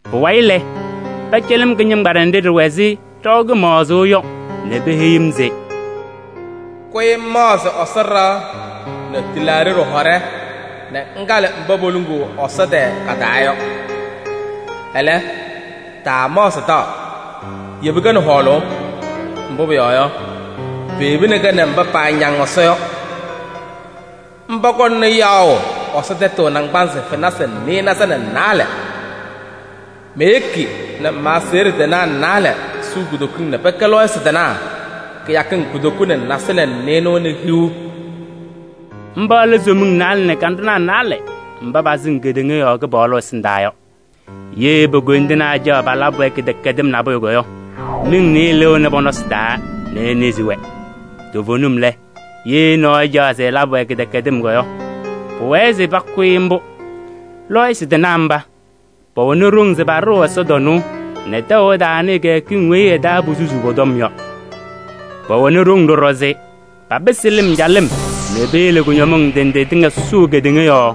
Pʋwayɩ lɛ, pɛcɛlɩ-m kɩñɩŋgbaɖɛ nɖɩ ɖɩwɛ ɛzɩ ɖaʋ kɩmaɣzʋʋ yɔ nɛ peheyi-m se: “Kʋyɩ ŋmaɣzɩ Ɛsɔ ɖɩɣa nɛ tɩlaaɖɩ ɖɩhɔɖɛ nɛ ŋkalɩ mba poluŋuu Ɛsɔ tɛɛ ka-taa yɔ. Ɛlɛ, taamaɣzɩ taɣ, yebi-kɛ nɛ hɔɔlʋʋ. Mbʋ pʋyɔɔ yɔ, peyebini-kɛ nɛ mba paañaŋ Ɛsɔ yɔ, mba kɔŋna yaɣʋ Ɛsɔ tɛtʋ naŋgbanzɩ fenasɩ nɩɩnaza nɛ naalɛ. Meyeki nɛ ma-aseɣɖe tɩnaa naalɛ suu kutokiŋ nɛ pɛkɛ lɔɔyɩsɩ tɩnaa kɩyakɩŋ kutoku nɛ nasɩlɛ nɛ nɩɩnʋwa nɛ hiu.” Mba lɛ somiŋ naalɛ nɛ kanɖʋnaa naalɛ mba pasɩŋ kedeŋa yɔɔ Kɩpaɣlʋ ɛsɩndaa yɔ. Ye po-koyindinaa ɛcaɣ se palabɩ-wɛ kɩdɛkɛdɩm nabʋyʋ yɔ, miŋ nɩɩyɩ lɩɣnɩ pɔ-nɔsɩ taa nɛ enezi-wɛ. Toovenim lɛ, ye nɔɔyʋ ɛcaɣ se ɛlabɩ-wɛ kɩdɛkɛdɩm yɔ, pʋwɛɛ se pʋkʋ-ɩ mbʋ. Lɔɔyɩsɩ tɩnaa mba, pɛwɛnɩ ɖoŋ se paɖɩɣ ɛsɔtɔnʋʋ nɛ tɛʋ ɛtaanɩɩ kɩyakɩŋ weyi ɩ-taa posusuu pɔ-tɔm yɔ. Pɛwɛnɩ ɖoŋ ɖɔɖɔ se papɩsɩ lɩm calɩm nɛ peyele kʋñɔmɩŋ ndɩ ndɩ tɩŋa sʋʋ kedeŋa yɔɔ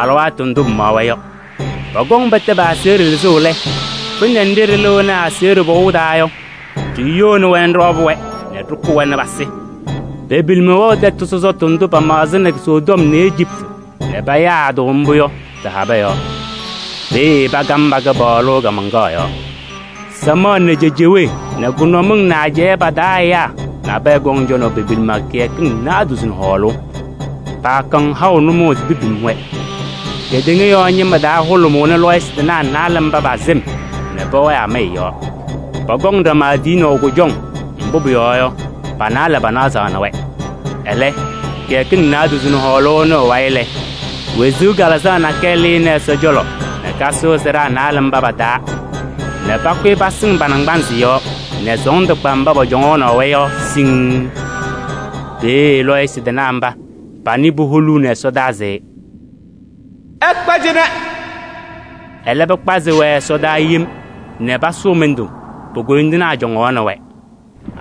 alɩwaatʋ ndʋ pɩmaɣ-wɛ yɔ. Pɔkɔŋ pɛtɛ pa-aseɣɖe lɩzʋʋ lɛ, kpɩnɛ nɖɩ ɖɩlɩɣnɩ asayʋʋ pɔʋ taa yɔ, ɖiyoni-wɛ nɛ ɖɩwabɩ-wɛ nɛ ɖɩkʋ-wɛ pasɩ. Pe-pilima wɛɣ tɛtʋ sɔsɔtʋ ndʋ pamaɣzɩnɩ Sodom nɛ Ejiptɩ nɛ payaa-tʋ mbʋ yɔ tɩ-habɛɛ yɔɔ. Peeye pakam pa-Kɩpaɣlʋ kaamaŋkaɣ yɔɔ. Samaɣ nɛ cejewee nɛ kʋnʋmɩŋ nɛ ajɛɛ pa-taa ɛyaa nabɛyɛ kɔŋ cɔnaʋ pe-pilima kɩyakɩŋ naadozo nɛ hɔɔlʋʋ. Paakɔŋ haʋ nʋmɔʋ se pepim-wɛ. Kedeŋa yɔɔ ñɩma taa hʋlʋmʋʋnɩ lɔɔyɩsɩ tɩnaa naalɛ mba pa-sɩm nɛ pɛwɛɛ amaya yɔɔ. Pɔkɔŋ ɖama tiyinaʋ kʋjɔŋ, mbʋ pʋyɔɔ yɔ, pa-naalɛ panazaɣnɩ-wɛ. Ɛlɛ, kɩyakɩŋ naadozo nɛ hɔɔlʋʋ ɩnʋ ɩ-wayɩ lɛ, wezuu kalɩzaɣ nakɛyɛ lɩnɩ Ɛsɔ cɔlɔ nɛ kasʋʋ sɩɖaa naalɛ mba pa-taa nɛ pakʋyɩ pasɩŋ pa-naŋgbanzɩ yɔɔ nɛ sɔɔndʋ kpa mba pɔcɔŋaɣnɩ-wɛ yɔ siŋŋ. Peeye lɔɔyɩsɩ tɩnaa mba, panɩ puholuuni ɛsɔdaa se: “Ɩkpa cɩnɛ!” Ɛlɛ pɩkpazɩ-wɛ ɛsɔdaa yem nɛ pasʋʋ mɩndʋ, po-koyindinaa cɔŋaɣnɩ-wɛ.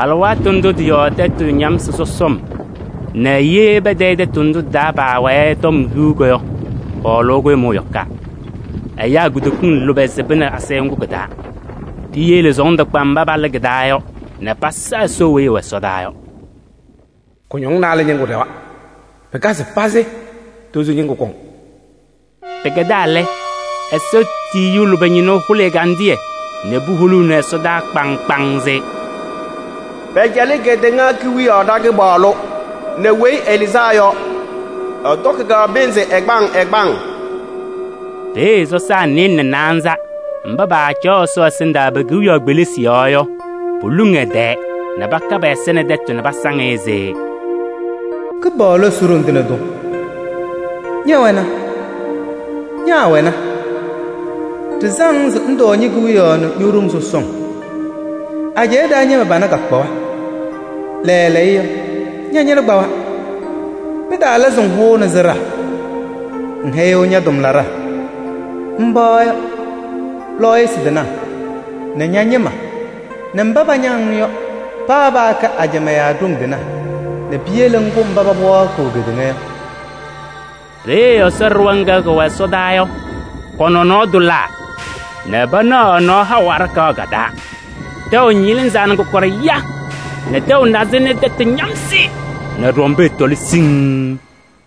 Alɩwaatʋ ndʋ tɩ-yɔɔ tɛtʋ ñamsɩ sɔsɔm nɛ ye patayɩ tɛtʋ ndʋ tɩ-taa paawɛɛ yɔ tɔm hiu yɔ, hɔɔlʋʋ kʋɖʋmʋʋ yɔkaa. Ɛyaa kutokiŋ lʋbɛ sɩbɩnɩ asayʋʋ ŋgʋ kɩ-taa. Piyele sɔɔndʋ kpa mba palɩ kɩ-taa yɔ nɛ pasa Ɛsɔ weyi ɛwɛ ɛsɔdaa yɔ. Kʋñɔŋ naalɛ ñɩŋgʋ ɖɛwa. Pɩkazɩ pazɩ, tozo ñɩŋgʋ kɔŋ. Pɩkɛdaa lɛ, Ɛsɔ tiyiyu lʋbɛ ñɩnʋ hʋlɩ ɛgandɩyɛ nɛ puholuuni ɛsɔdaa kpaŋŋ kpaŋŋ se: “Pɛcɛlɩ kedeŋa kewiyaɣ ɖa-Kɩpaɣlʋ nɛ Weyi Ɛlɩzaa Yɔ. Ɛtɔkɩ-kɛ pɩnzɩ ɛgbaŋ ɛgbaŋ!” Peeye sɔsaa nɩɩlɛ nɛ naanza mba paacaɣ Ɛsɔ ɛsɩndaa pe-kewiyaɣ kpelisi yɔɔ yɔ, poluŋ ɛ-tɛɛ nɛ paka pɛ-ɛza nɛ tɛtʋ nɛ pasaŋ-ɩ se: “Kɩpaɣlʋ Ɛsɔ, Ɖoŋ Tɩŋa Tʋ! Ñɛwɛna, ñaawɛna, ɖɩsaŋ-ŋ se ŋtɔɔ ñe-kewiyaɣ nɛ ño-ɖoŋ sɔsɔŋ. Ajɛɛ taa ñɩma pana kakpawa, lɛɛlɛɛyɔ ña-ñɩna ñakpawa! Pɩtalaa se ŋhʋnɩ sɩɖaa: ŋhɛyɩɣ ña-tʋmlaɖaa, mba yɔ: lɔɔyɩsɩ tɩnaa nɛ ña-ñɩma nɛ mba pañaŋ-ŋ yɔ, paa paakɛ ajamaa yaa ɖoŋ tɩnaa nɛ piyele ŋkʋ mba paba wɛɛkɩɣ kedeŋa yɔ.” Peeye Ɛsɔ ɖɩɣa ŋga kɛwɛ ɛsɔdaa yɔ, kɔ-nɔnɔɔ tʋlaa nɛ panaɣ ɛ-nɔɔ haʋ aɖakaɣ ka-taa. Tɛʋ ñɩlɩzaa nɛ kɔkɔɖɛ ya nɛ tɛʋ nazɩ nɛ tɛtʋ ñamsɩ nɛ ɖɔmbɛɛ tɔlɩ siŋŋ.